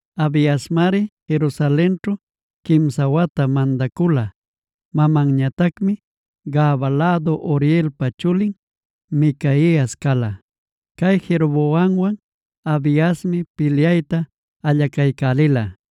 Abiasmari Jerusalenćhu quimsa wata mandacula. Mamanñatacmi Gabaa lädu Urielpa chulin Micaias cala. Cay Jeroboamwan Abiasmi pilyayta allacaycälila.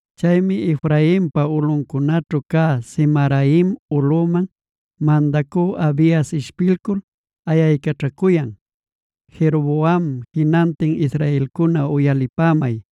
Chaymi Efrainpa ulꞌuncunaćhu cä Zemaraim ulꞌuman mandacü Abias ishpilcul ayaycaćhacuyan: “¡Jeroboam, jinantin israelcuna uyalipämay!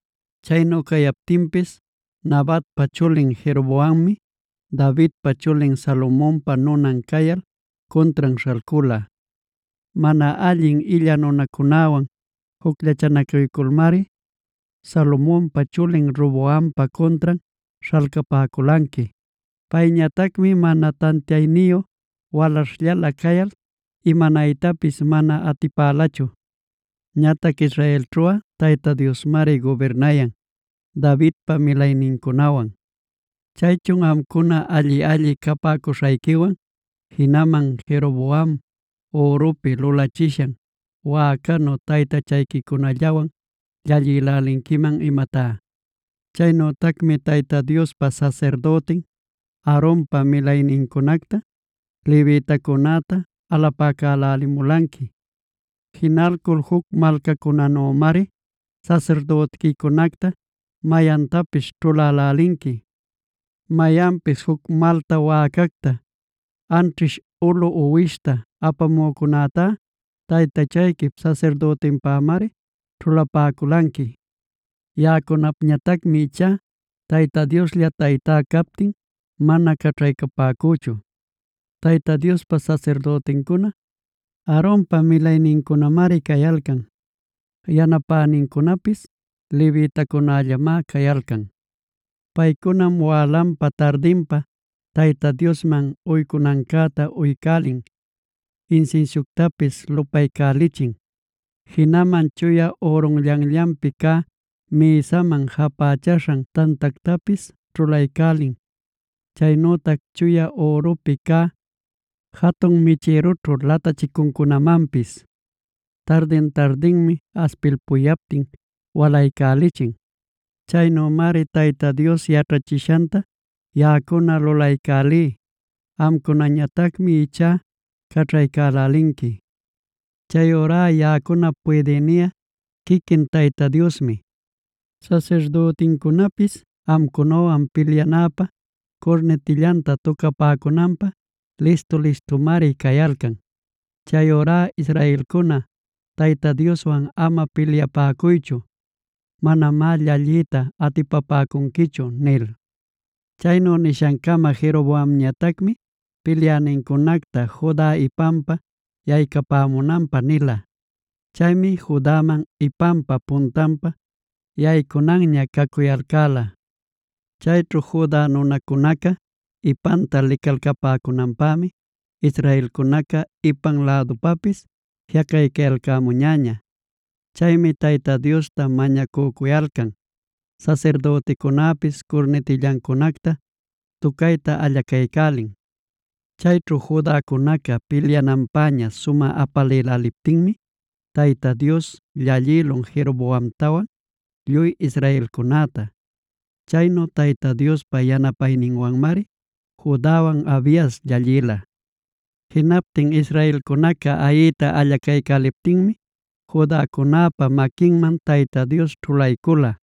Chaynu cayaptinpis Nabatpa chulin Jeroboammi, Davidpa chulin Salomonpa nunan cayal cuntran śhalcula. Mana allin illa nunacunawan jucllachanacuyculmari Salomonpa chulin Roboampa cuntran śhalcapäculanqui. Payñatacmi mana tantiayniyu walaśhllala cayal imanaytapis mana atipälachu. “Ñatac israelćhuꞌa Tayta Diosmari gubirnayan Davidpa milaynincunawan. ¿Chaychun amcuna alli-alli capäcuśhayquiwan, jinaman Jeroboam ürupi lulachishan wäcanu taytachayquicunallawan llallïlälinquiman imatá? Chaynütacmi Tayta Diospa sasirdütin Aaronpa milaynincunacta, levitacunäta alapacälälimulanqui. Jinalcul juc malcacunänümari sasirdütiquicunacta mayantapis ćhulälälinqui. Mayanpis juc malta wäcacta anćhish ulu uwishta apamücunätá, taytachayquip sasirdütinpämari ćhulapäculanqui. “Yaꞌacunapñatacmi ichá Tayta Dioslla Taytá captin, mana caćhaycapäcüchu. Tayta Diospa sasirdütincuna, Aaronpa milaynincunamari cayalcan; yanapänincunapis levitacunällamá cayalcan. Paycunam wälanpa-tardinpa Tayta Diosman uycunancäta uycälin, insinsiuctapis lupaycälichin. Jinaman chuya ürunllanllanpi cä mïsaman japächaśhan tantactapis ćhulaycälin, chaynütac chuya ürupi cä jatun michïrućhu latachicuncunamanpis tardin-tardinmi aspilpuyaptin walaycälichin. Chaynümari Tayta Dios yaćhachishanta yaꞌacuna lulaycälí. Amcunañatacmi ichá caćhaycälälinqui. Chayurá yaꞌacunap puydïniꞌa quiquin Tayta Diosmi. Sasirdütincunapis amcunawan pilyanapä curnitillanta tucapäcunanpä listu-listumari cayalcan. Chayurá israelcuna, Tayta Dioswan ama pilyapäcuychu; manamá llalliyta atipapäcunquichu” nil. Chaynu nishancama Jeroboamñatacmi pilyänincunacta Juda ipanpa yaycamunanpä nila. Chaymi Judaman ipanpa puntanpa yaycunanña cacuyalcäla. Chayćhu Juda nunacunaca ipanta licalcapäcunanpämi israelcunaca ipan lädupapis jiꞌacaycayalcämuñäña. Chaymi Tayta Diosta mañacücuyalcan, sasirdüticunäpis curnitillancunacta tucayta allacaycälin. Chayćhu Judacunaca pilyananpäña sumä apalïläliptinmi Tayta Dios llallïlun Jeroboamtawan lluy israelcunäta. Chaynu Tayta Diospa yanapayninwanmari Judawan Abias llallïla. Jinaptin israelcunaca ayiyta allacaycäliptinmi Judacunäpa maquinman Tayta Dios ćhulaycüla.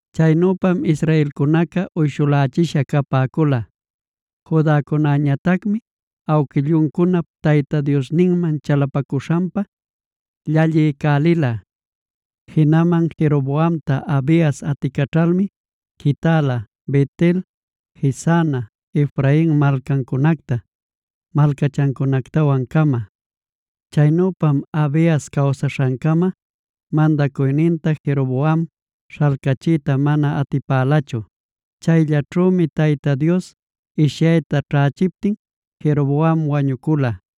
Chaynüpam israelcunaca uyshulächisha capäcula. Judacunäñatacmi awquilluncunap Tayta Diosninman chalapacuśhanpa llalliycälila. Jinaman Jeroboamta Abias aticaćhalmi quitäla: Bet-el, Jesana, Efrain malcancunacta malcachancunactawan-cama. Chaynüpam Abias cawsaśhancama mandacuyninta Jeroboam śhalcachiyta mana atipälachu. Chayllaćhümi Tayta Dios ishyayta ćhächiptin Jeroboam wañucula.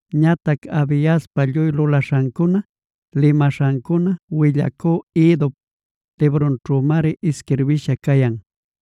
Ñatac Abiaspa lluy lulaśhancuna, limaśhancuna willacü Iddop librunćhümari isquirbïsha cayan.